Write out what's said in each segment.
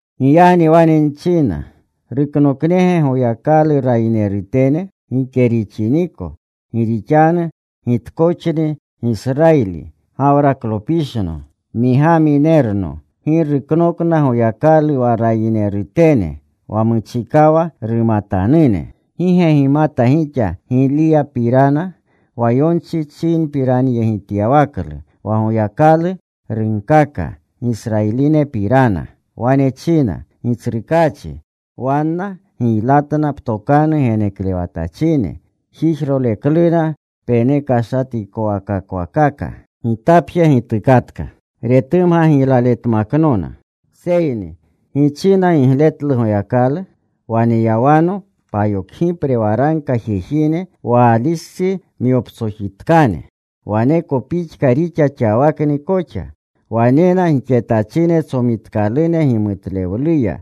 Giyagni wane nchina, ¿Ruknoknege Goyakalu rayinerutene? Gike rixiniko. Gi rixanu gitkoxni Gisrayili, Gawraklopishno, Migaminerno. Gi ruknokna Goyakalu wa rayinerutene, wa muchikawa rumatanune. ¿Gi ge gimata gixa Giliyapirana? Wa yonchi chinpiranyegityawaklu, wa Goyakalu runkaka Gisrayilinepirana. Wane china, “Gitsrukaachi, wanna giylatna ptokanu geneklewatachine. Jijrolekluna penekashatikowakakwakaka. Gitapje gitukatka. Retumga giylaletmaknona.” Seyni ¿gi china gigletlu Goyakalu? “Waneyawano payokgipre waragka jejine Waalistsi myoptsojitkane.” Waneko pixka rixa xawakni koxa, wanena gixetachine tsomitkalune gimutlewluya.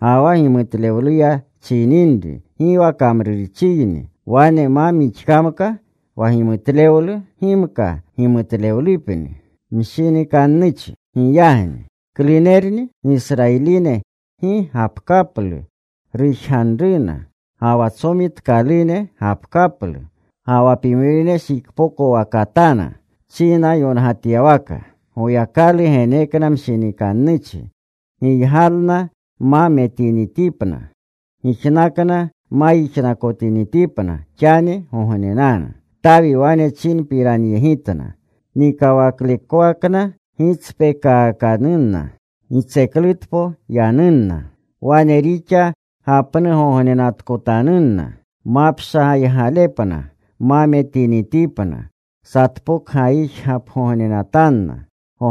Ga wa gimutlewluya chininri, gi wa kamrurchiyni. Wane ma mixkamka wa gimutlewlu gimka gimutlewlupni. Giyagni ¿klunerni? Gisrayiline gi gapkaplu rujganruna, ga wa tsomitkalune gapkaplu, ga wa pimrine shikpokwakatana. Chinyongatyawaka: Goyakalu genekna mshinikannuchi, giygalna ma metinitipna, gijnakna ma yijnakotinitipna xanigognenanu. Tawi wane chinpiranyegitanna: Nikawaklekwakna gitspekakanunna; gitseklutpo yanunna. Wane rixa gapnugognenatkotanunna. Mapshagaygalepna ma metinitipna. Satpokgayijgapgognenatanna.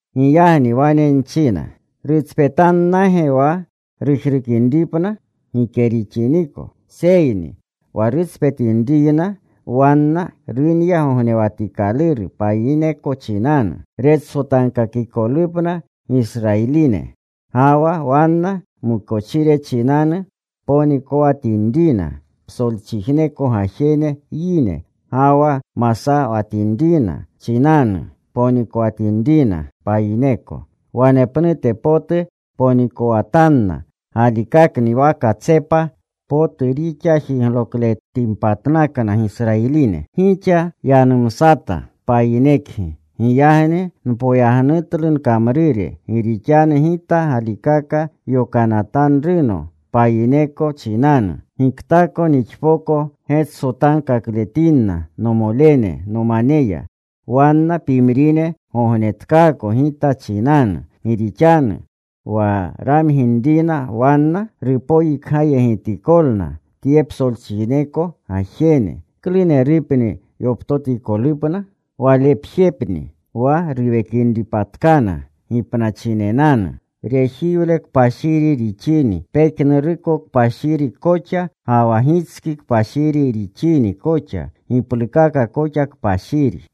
Giyagni wane nchina, ¿rutspetannage wa rujrukinripna? Gike rixiniko. Seyni wa rutspetinriyna wanna runya gognewatikaluru payineko chinanu, retsotankakikolupna Gisrayiline. Ga wa wanna mukochire chinanu ponikowatinrina psolchijneko gajene yine, ga wa masawatinrina chinanu ponikowatinrina payineko, wanepnute potu ponikowatanna galikakni wa katsepa potu rixa jiglokletinpatnakna Gisrayiline. Gixa nuynumsata, payinekgi. Giyagni npoyagnutlu nkamrure, gi rixanu gita galikaka yokanatanruno payineko chinanu. Giktako nixpoko getsotankakletinna nomolene nomaneya, wanna pimrine gognetkaako gita chinanu. Gi rixanu wa ramginrina wanna, rupoyikgayegitikolna tye psolchijneko gajene, ¿klunerupni yoptotikolupna? Walepjepni wa ruwekinripatkana gipnachinenanu. Rejiwle kpashiri rixini, pejnuruko kpashiri koxa. Ga wa gitski kpashiri rixini koxa, giplukaka koxa kpashiri.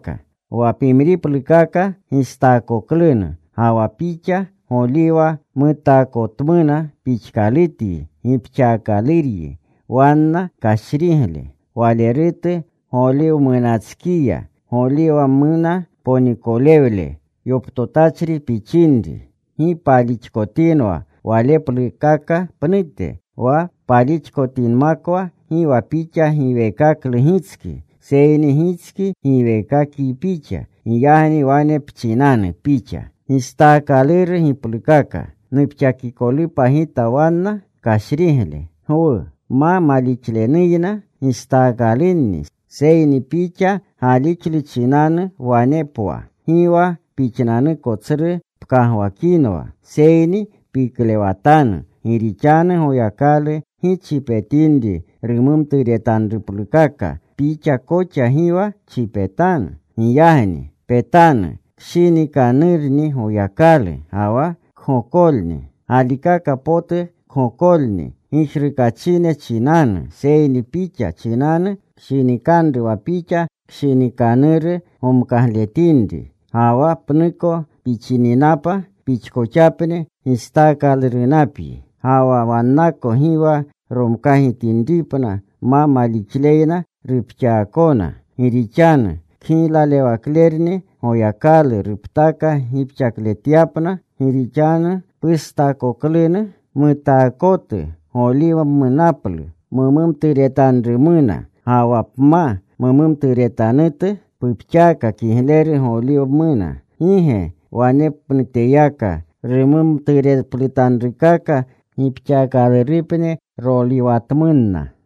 Wa pimriplukaka gistaakoklunu, ga wa pixa goliwa mutaakotmuna pixkalutyi gipxaakaluryi wanna kashrigle. Walerutu goliwamunatskiya, goliwamuna ponikolewle yoptotachri pixinri, gi palixkotinwa waleplukaka pnute. Wa palixkotinmakwa, gi wa pixa giweekaklu gitski, seyni gitski giweekakyi pixa. Giyagni wane pchinanu pixa, “Gistaakaluru giplukaka, nupxakikolupa gita wanna kashrigle.” Gwu. Ma malixlenuyna gistaakalunni, seyni pixa galixlu chinanu wane pwa. Gi wa pixnanuko tsru pkagwakinwa, seyni piklewatanu. Gi rixanu Goyakalu gi chipetinri rumaturewaplutanrukaka, pixa koxa gi wa chipetanu. Giyagni petanu kshinikanurni Goyakalu ga wa kgokolni. Galikaka potu kgokolni gijrukachine chinanu, seyni pixa chinanu kshinikanru wa pixa kshinikanuru gomkagletinri. Ga wa pnuko pixininapa pixkoxapni gistaakalurunapyi. Ga wa wannako gi wa romkagitinripna ma malixleyna rupxaakona. Gi rixanu kgiyaklewaklerni Goyakalu ruptaka gipxakletyapna. Gi rixanu pustaakoklunu mutaakotu goliwamunapu mumturetanrumuna, ga wa pma mumturetanutu pupxaaka kigleru goliwmuna, ¿gi ge wanepnuteyaka rumumtureplutanrukaka gipxaakalurupni roliwatmunna?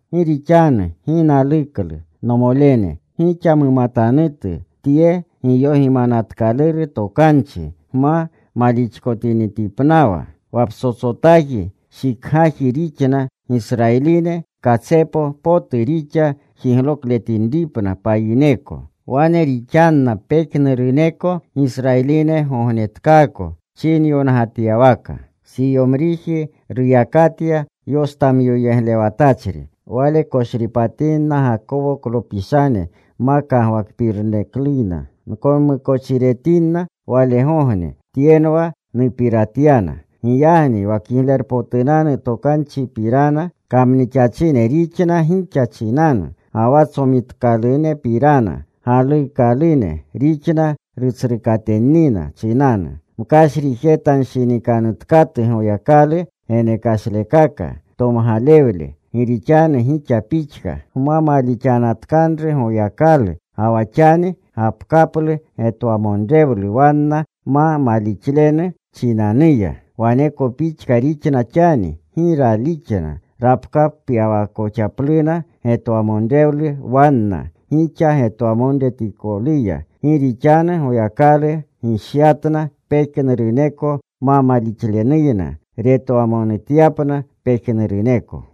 Gi rixanu gi naluklu, nomolene, gixa mumatanutu tye giyogimanatkaluru tokanchi, gma malixkotinitipnawa. Wa ptsotsotaji shikgaji rixna Gisrayiline katsepa potu rixa jiglokletinipna payineko. Wane rixanna pejnuruneko Gisrayiline gognetkaako, chinyongatyawaka: Siyomriji ruyakatya yostamyoyeglewatachri. Wale koshripatinna Gakowoklopishane ma kagwakpirnukleyna. Nkonmukochiretinna walgogne. Tyenwa nupiratyana. Giyagni wa Kiglerpotunanu Tokanchipirana kamnixachine rixna gixa chinanu, ga wa tsomitkoklunupirana galuukalune rixna rutsrukatennina chinanu. Mkashrijetanshinikanutkatu Goyakalu genekashlekaka, tomgalewle. Gi rixanu gixa pixka gma malixanatkanru Goyakalu, ga wa xani gapkaplu getwamonrewlu wanna ma malixlenu chinanuya. Waneko pixka rixna xani. Gi ralixna. Rapkapyakoxapluna getwamonrewlu wanna, gixa getwamonutikoluya. Gi rixanu Goyakalu gishyatna pejnuruneko ma malixlenuyna, retwamonutyapna pejnuruneko.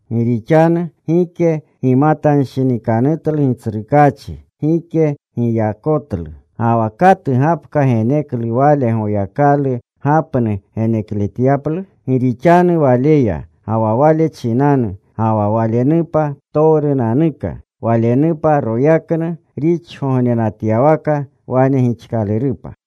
Gi rixanu gike gimatanshinikanutlu Gitsrukaachi. Gike giyakotlu. Ga wa ¿katu gapka geneklu Wale, Goyakalu gapnu genekletyaplu? Gi rixanu Waleya, ga wa Wale chinanu, ga wa Walenupa ptowrunanuka. Walenupa royaknu rixgognenatyawaka. Wane gixkalurupa.